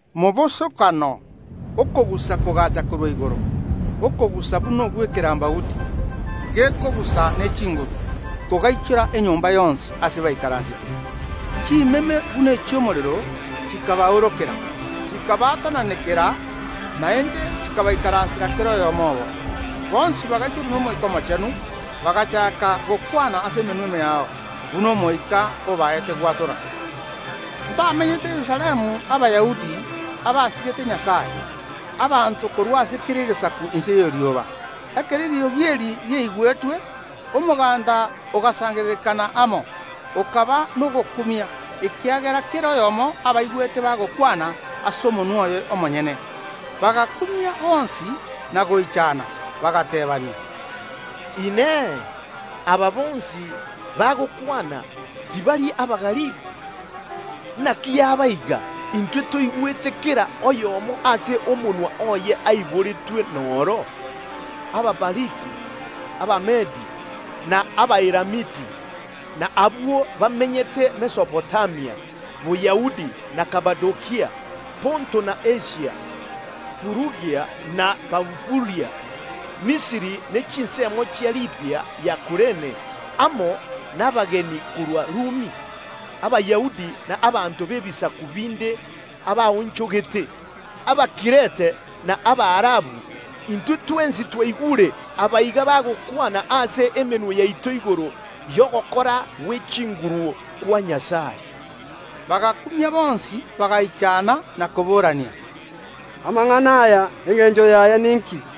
Mobosokano okogusa kogaacha korwa igoro, okogusa buna ogw’ekerambauti gekogusa ne chinguru, kogaichora enyomba yonsi aase baikaransete. Chimeme buna echi’omorero chikabaorokera, chikabaatananekera, naende chikabaikaransera kera oyomo obo. Bonsi bagaichorwa n’Omoika Omochenu, bagachaaka gokwana ase emenwa emeao, buna Omoika obaete gwatora. Mbamenyete Yerusalemu Abayahudi abasigete Nyasae, abanto korwa ase kera egesaku inse y’erioba. Ekero eriogi eri riaigwetwe, omoganda ogasangererekana amo, okaba nogokumia, ekiagera kera oyomo abaigwete bagokwana ase omonwa oye omonyene. Bagakumia bonsi na goichana, bagateebania: “Inee! Aba bonsi bagokwana, tibari Abagalili? Naki yaba iga, intwe toigwete kera egento bagokwana kera oyomo ase omonwa oye aiboretwe noro? Abapariti, Abamedi na Abaelamiti, na abwo bamenyete Mesopotamia, Boyahudi na Kapadokia, Ponto na Asia, Furugia na Pamfulia, Misiri ne chinsemo chia Libia ya Kurene, amo nabageni korwa Rumi, Abayahudi na abanto b’ebisaku binde abaonchogete, Abakirete na Abaarabu, intwe twensi twaigure aba iga bagokwana ase emenwa yaito igoro y’ogokora gwe chinguru kwa Nyasae.” Bagakumia bonsi, bagaichana na koborania: “Amang’ana aya, engencho yaye ninki?”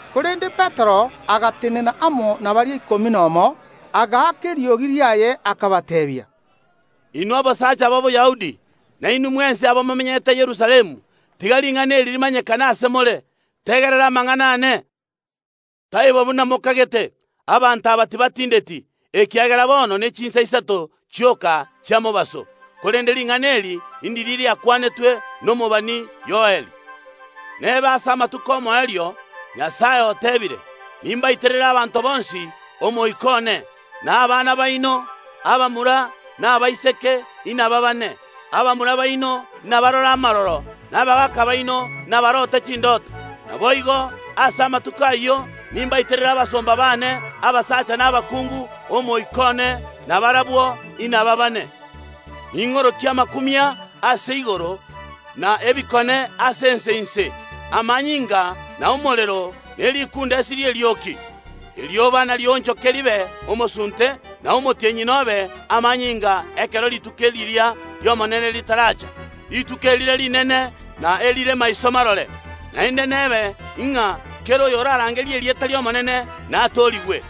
Korende Petero agatenena amo na baria ikomi nomo, agaaka eriogi riaye, akabateebia: “Inwe abasacha ba Boyahudi, na inwe mwensi abamomenyete Yerusalemu, tiga ring’ana eri rimanyekane ase more, tegerera amang’ana aane. Taibo buna mokagete; abanto aba tibatindeti, ekiagera bono nechinsa isato chioka chia mobaso, korende ring’ana eri ndiria riakwanetwe nomobani Yoel: “Nebe ase amatuko ’omoerio, Omonene oteebire, nimbaiterere abanto bonsi Omoika one, na abana baino, abamura na abaiseke, inababane. Abamura baino nabarore amaroro, na abagaaka baino nabarote chindoto. Naboigo, ase amatuko ayio nimbaiterere abasomba baane, abasacha na abakungu, Omoika one, na barabwo inababane. Ning’orokie amakumia ase igoro, na ebikone ase ense inse, amanyinga na omorero, ne rikundesi ri’erioki. Erioba narionchoke ribe omosunte, na omotienyi nobe amanyinga, ekero rituko riria ri’Omonene ritaracha, rituko erire rinene, na erire maiso marore. Naende nebe ng’a kera oyorarangerie erieta ri’Omonene natoorigwe”.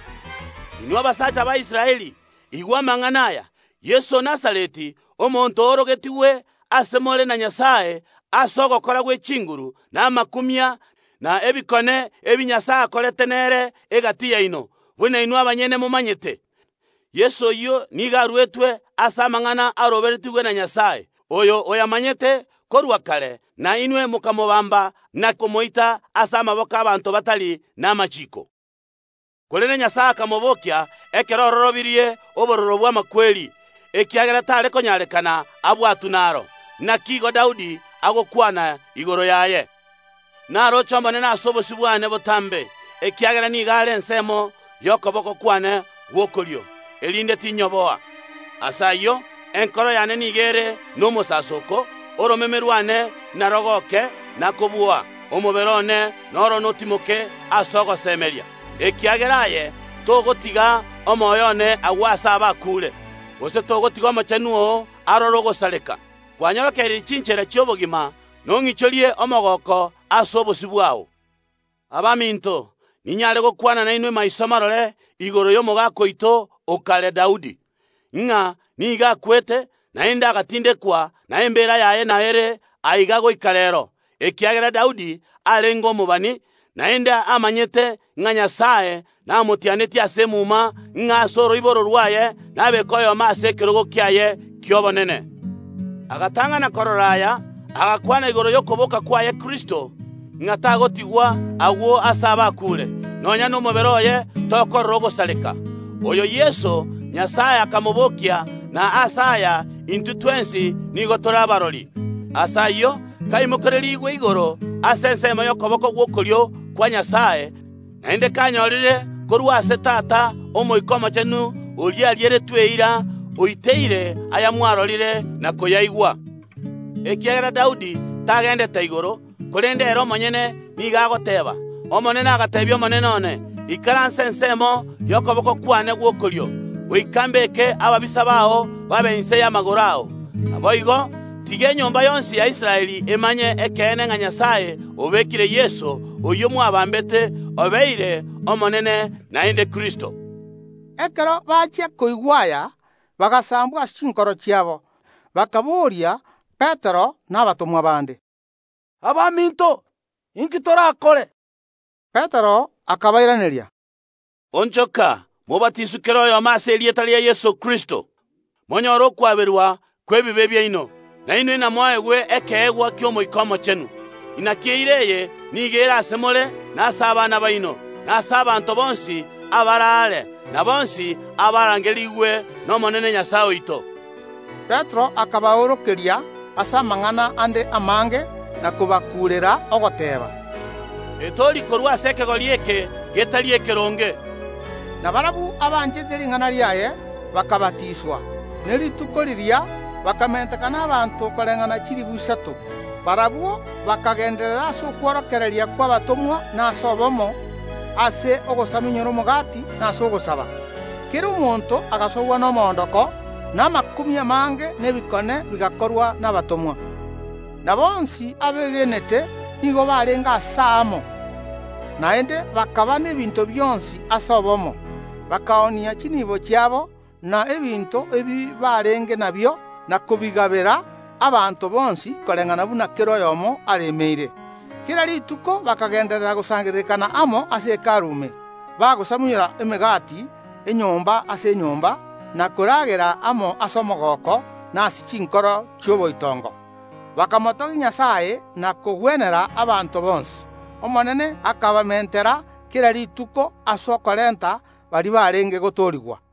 Inwe abasacha ba Israeli, igwa amang’ana aya, Yeso o Nazareti, omonto o orogetigwe ase more na Nyasae ase ogokora gwe chinguru, na amakumia, na ebikone ebi Nyasae akorete nere egati yaino, buna inwe abanyene momanyete, Yeso oyio nigo aruetwe ase amang’ana aroberetigwe na Nyasae, oyo oyamanyete korwa kare, na inwe mokamobamba na komoita ase amaboko ’abaanto batari namachiiko. Korende Omonene akamobokia ekero ororobirie obororo bw’amakweri, ekiagera tare konyarekana abwatwe naro. Naki igo Daudi agokwana igoro yaye: Naroche Omonene ase obosio bwane botambe, ekiagera nigo are ensemo y’okoboko kwane gw’okorio, erinde tinyoboa. Ase ayio enkoro yane nigo ere nomosasooko, oromeme rwane narogooke; na kobua, omobere one noro notimoke ase ogosemeria, ekiagera aye togotiga omoyo one agwo aase abakuure, gose togotiga Omochenu oo arore ogosareka. Kwanyorokereirie chinchera chi’obogima; nong’ichorie omogooko ase obosio bwao. Abaminto, ninyare gokwana nainwe maiso marore igoro y’omogaka oito o kare, Daudi, ng’a nigo akwete, naende agatindekwa, na embeera yaye nao ere aiga goika reero. Ekiagera Daudi arenge omobani, naende amanyete ng’a Nyasae namotianetie ase emuma ng’a ase oroiboro rwaye nabeeke oyomo ase ekerogo kiaye ki’obonene, agatang’ana korora aya, agakwana igoro y’okoboka kwaye Kristo, ng’a tagotigwa agwo aase abakuure, nonya nomobere oye tokorora ogosareka. Oyo Yeso Nyasae akamobokia na ase aya intwe twensi nigo tore kirori. Ase ayio, kaimokererigwe igoro ase ensemo y’okoboko gw’okorio kwa Nyasae, naende kanyorire korwa ase Tata Omoika Omochenu oria arieretwe eira oiteire ayamwarorire na koyaigwa. Ekiagera Daudi tagendete igoro, korende ere omonyenye nigo agoteeba: “Omonene agateebia Omonene one, Ikaransa ensemo y’okoboko kwane gw’okorio, goika mbeke ababisa bao babe inse y’amagoro ao”. Naboigo, tiga enyomba yonsi ya Israeli emanye ekeene ng’a Nyasae obekire Yeso, oyio mwabambete, obeire Omonene naende Kristo. Ekero bachia koigwa aya, bagasambwa ase chinkoro chiabo, bakabooria Petero na abatomwa bande: “Abaminto, inki torakore?” Petero akabairaneria: “Onchoka, mobatiswe kera oyomo ase erieta ria Yeso Kristo, monyore okwaberwa kw’ebibe biaino, na inwe inamoegwe ekeegwa ki’Omoika Omochenu. Naki eira eye nigo ere ase more na ase abana baino, na ase abanto bonsi abare aare, na bonsi abarangerigwe n’Omonene nyasae oito.” Petero akabaorokeria ase amang’ana ande amange na kobakuurera, ogoteeba: “Etoorie korwa ase ekegori eke getari ekeronge.” Na barabwo abanchete ring’ana riaye bakabatiswa, ne rituko riria bakamentekana abanto koreng’ana chilifu isato. Barabwo bakagenderera ase okworokereria kw’abatomwa na ase obomo, ase ogosamunyora omogati na ase ogosaba. Kera omonto agasogwa nomoondoko, na amakumia amange na ebikone bigakorwa nabatomwa. Na bonsi abeegenete nigo barenge aase aamo, naende bakaba n’ebinto bionsi ase obomo; bakaoonia chinibo chiabo na ebinto ebibarenge nabio, na kobigabera abanto bonsi koreng’ana buna kera oyomo aremeire. Kera rituko bakagenderera gosangererekana amo ase Hekalu ime, bagosamunyora emegati enyomba ase enyomba na koragerera amo ase omogooko na ase chinkoro chi’oboitongo, bakomotogia Nyasae na kogwenera abanto bonsi. Omonene akabamentera kera rituko ase okorenta baria barenge gotoorigwa.